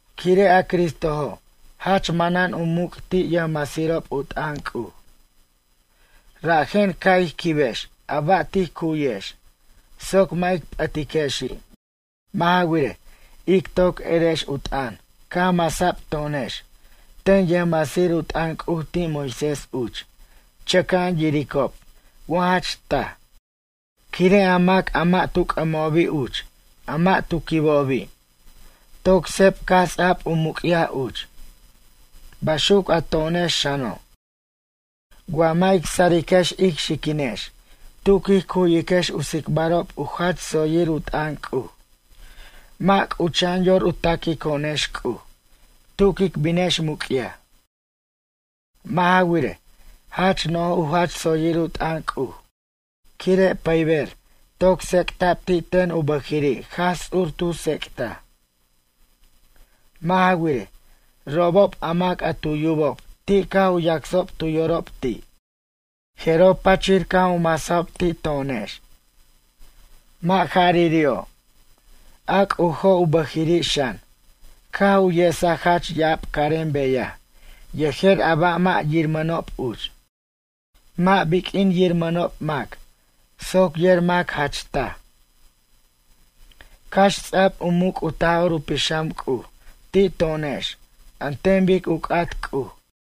Quire' a Cristojo' jach manan u muc' ti' yʌjmasirob u t'ʌn C'uj, rajen ca' ij quibex a ba' tij cu'yex soc mʌ' ic p'ʌtiquexi'. Mʌ' ja wirej, ic toc erex u t'ʌn caj masa'b to'onex ten yʌjmasir u t'ʌn C'uj ti' Moisés uch chʌca'an yiricob wa jach taj, quire' a mac a mʌ' tu c'ʌmobi' uch a mʌ' tu quibobi', toc seb caj ts'a'b u muc'yaj uch. Baxuc a to'onex xano', Wa mʌ' ic sariquex ic xiquinex tu quij cu'yiquex u tsicbarob u jach tsoyir u t'ʌn C'uj. Mʌ' c'ucha'an yor u taquico'onex C'uj tu quic binex muc'yaj. Mʌ' ja wirej, jach no'j u jach tsoyir u t'ʌn C'uj quire' pʌyber toc tsec'ta'b ti' ten u bʌjiri' Jaj Ts'ur tu tsec'taj. Mʌ' ja wirej, robob a mac a tu yubob ti' caj u yacsob tu yorob ti', jeroj pachir caj u masajob ti' to'onex. Mʌ' jariri'o', a C'ujo' u bʌjiri' xan, caj u yesaj jach ya'ab carem beyaj yejer a ba' mʌ' yiramʌnob uch, mʌ' biq'uin yiramʌnob mac soc yer mac jach taj. Cax ts'ab u muc' u Taj'or u Pixam C'uj ti' to'onex an ten bic u c'at C'uj.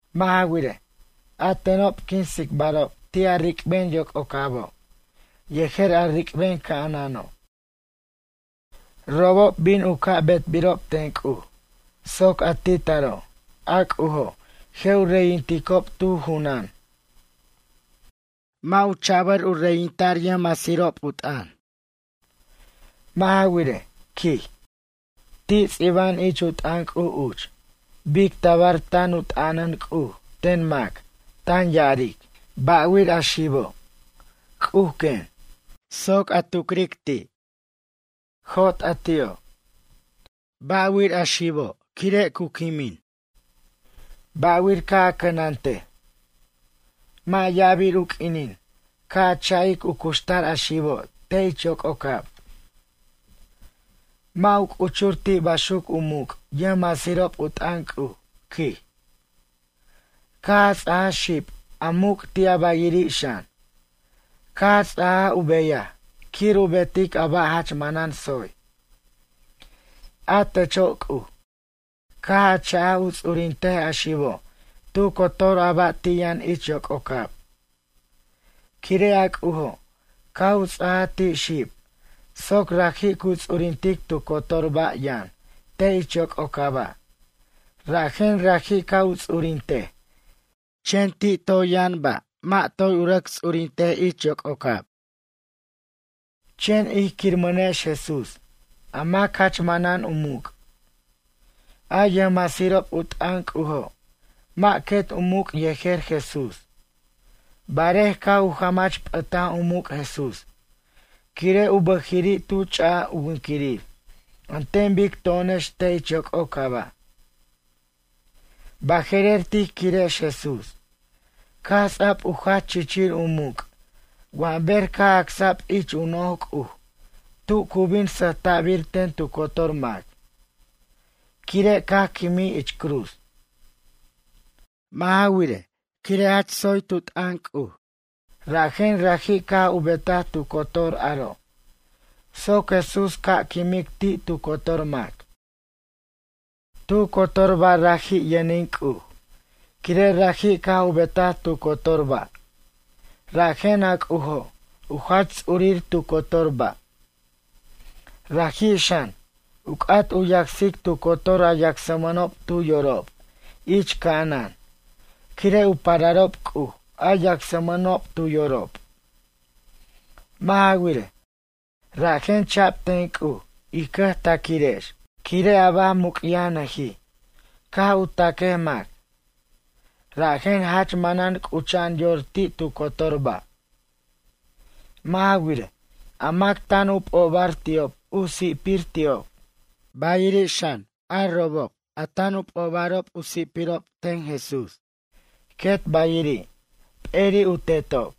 Mʌ' ja wirej, a tenob quin tsicbarob ti' a ric'ben yoc'ocabo' yejer a ric'ben ca'anano'. Robob bin u ca' betbirob ten C'uj soc a ti' taro' a C'ujo' je' u reyinticob tu junan. Mʌ' u cha'bʌr u reyinta' yʌjmasirob u t'ʌn. Mʌ' ja wirej, quij, ti' ts'iba'an ich u t'ʌn C'uj uch bic tabar tan u t'anan C'uj ten mac tan ya'aric: Ba'wir a xibo', C'uj quen, soc a tucrej ti'? Jot a ti'o'. Ba'wir a xibo' quire' cu quimij? Ba'wir ca' a cʌnantej? Mʌ' ya'abir u q'uinin ca cha'ic u cuxtar a xibo' te' ich yoc'ocab. Mʌ' u c'uchur ti' baxuc u muc' yʌjmasirob a t'ʌn C'uj, quij. Caj a ts'ajaj xib a muc' ti' bayiri' xan, caj a ts'aja u beyaj quir u betic a ba' jach manan tsoy. A techo' C'uj, caj a cha'aj u ts'urintej a xibo' tu cotor a ba' a ti' yʌn ich yoc'ocab. Quire' a C'ujo' caj u ts'ajaj ti' xib soc raji' cu ts'urintic tu cotor ba' yʌn te' ich yoc'ocaba', rajen raji' ca' u ts'urintej, chen ti' toy yʌn ba' mʌ' toy rʌc u ts'urintej ich yoc'ocab. Chen ij quirmʌnex Jesús, a mac jach manan u muc', a yʌjmasirob u t'ʌn C'ujo', mʌ' quet u muc' yejer Jesús. Barej caj u jamach p'ʌtaj u muc' Jesús, quire' u bʌjiri' tu ch'aj u winquirir an ten bic to'onex te' ich yoc'ocaba'. Baje'rer tij quirex Jesús caj ts'a'b u jach chichir u muc' wa ber caj acsa'b ich u noj C'uj tu cu bin sʌjta'bir ten tu cotor mac, quire' caj quimij ich cruz. Mʌ' ja wirej, quire' jach tsoy tu t'ʌn C'uj rajen raji' caj u betaj tu cotor aro' soc Jesús ca' quimic ti' tu cotor mac. Tu cotor ba' raji' yʌnin C'uj, quire' raji' caj u betaj tu cotor ba' rajen a C'ujo' u jach ts'urir tu cotor ba'. Raji' xan, u c'at u yacsic tu cotor a yacsmʌnob tu yorob ich ca'anan quire' u pararob C'uj a yacsmʌnob tu yorob. Mʌ' ja wirej, rajen cha'b ten C'uj ij cʌjtaquirex quire' a ba' muc'yajnʌij ca' u taquej mac, rajen jach manan c'ucha'an yor ti' tu cotor ba'. Mʌ' ja wirej, a mac tan u p'obar ti'ob u si'pir ti'ob, bayiri' xan, a robob a tan u p'obarob u si'pirob ten Jesús, quet bayiri', p'eri' u Tetob.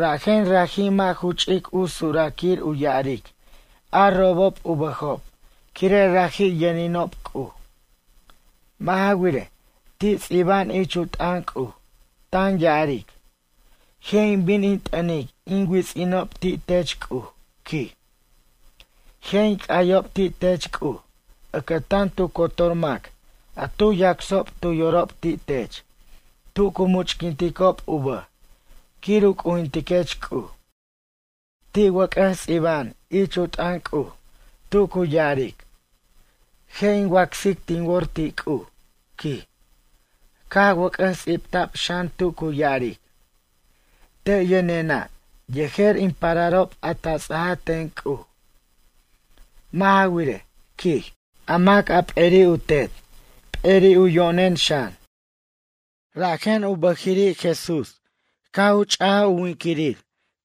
Rajen raji' mʌ' ju ch'ic u suraquir u ya'aric a robob u bʌjob quire' raji' yʌninob C'uj. Mʌ' ja wirej, ti' tsiba'an ich u t'ʌn C'uj, tan ya'aric: Je' in bin in t'ʌnic in wits'inob ti' tech C'uj, quij. Je' in c'ayob ti' tech C'uj ʌcʌtan tu cotor mac a tu yacsob tu yorob ti' tech tu cu much'quinticob u bʌj quir u c'ujintiquech C'uj. Ti' wʌc'ʌs ts'iba'an ich u t'ʌn C'uj tu cu ya'aric: Je' in wacsic tin wor ti' C'uj, quij. Caj wʌc'ʌs ts'ibta'b xan tu cu ya'aric: Te' yʌnena' yejer in pararob a ta ts'aj ten C'uj. Mʌ' ja wirej, quij, a mac a p'eri' u tet p'eri' u yo'nen xan. Rajen u bʌjiri' Jesús caj u ch'aj u winiquir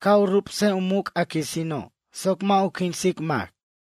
ca' u rubs u muc' a quisino' soc mʌ' u quinsic mac.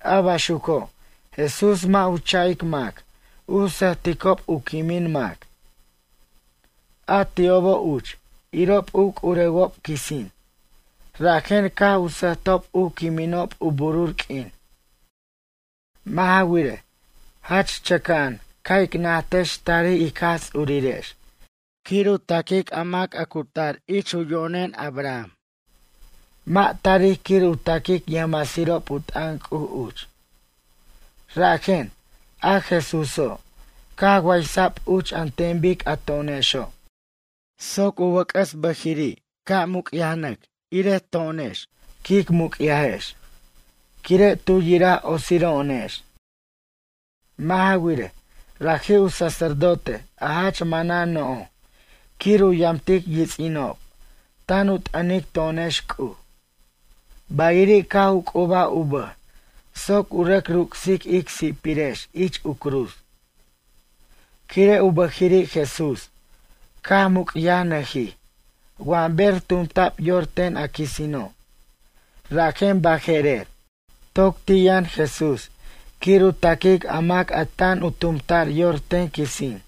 A baxuco' Jesús mʌ' u cha'ic mac u sʌjticob u quimin mac. A ti'obo' uch irob u c'urewob quisin, rajen caj u sʌjtob u quiminob u burur q'uin. Mʌ' ja wirej, jach chʌca'an ca' ic najtex tarij ic Jaj Ts'urirex quir u taquic a mac a cu tar ich u yo'nen Abraham, mʌ' tarij quir u taquic yʌjmasirob u t'ʌn C'uj uch. Rajen, a Jesúso' caj waysa'b uch an ten bic a to'onexo' soc u wʌc'ʌs bʌjiri' caj muc'yaj irej to'onex quic muc'yajex quire' tu yiraj otsiro'onex. Mʌ' ja wirej, raji' u sacerdote a jach manan no'j quir u yamtic yits'inob tan u t'ʌnic to'onex C'uj. Bayiri' caj u c'ubaj u bʌj soc u rʌc ruc'sic ic si'pirex ich u cruz. Quire' u bʌjiri' Jesús caj muc'yajnʌjij wa ber tumta'b yor ten a quisino', rajen baje'rer toc ti' yʌn Jesús quir u taquic a mac a tan u tumta'r yor ten quisin.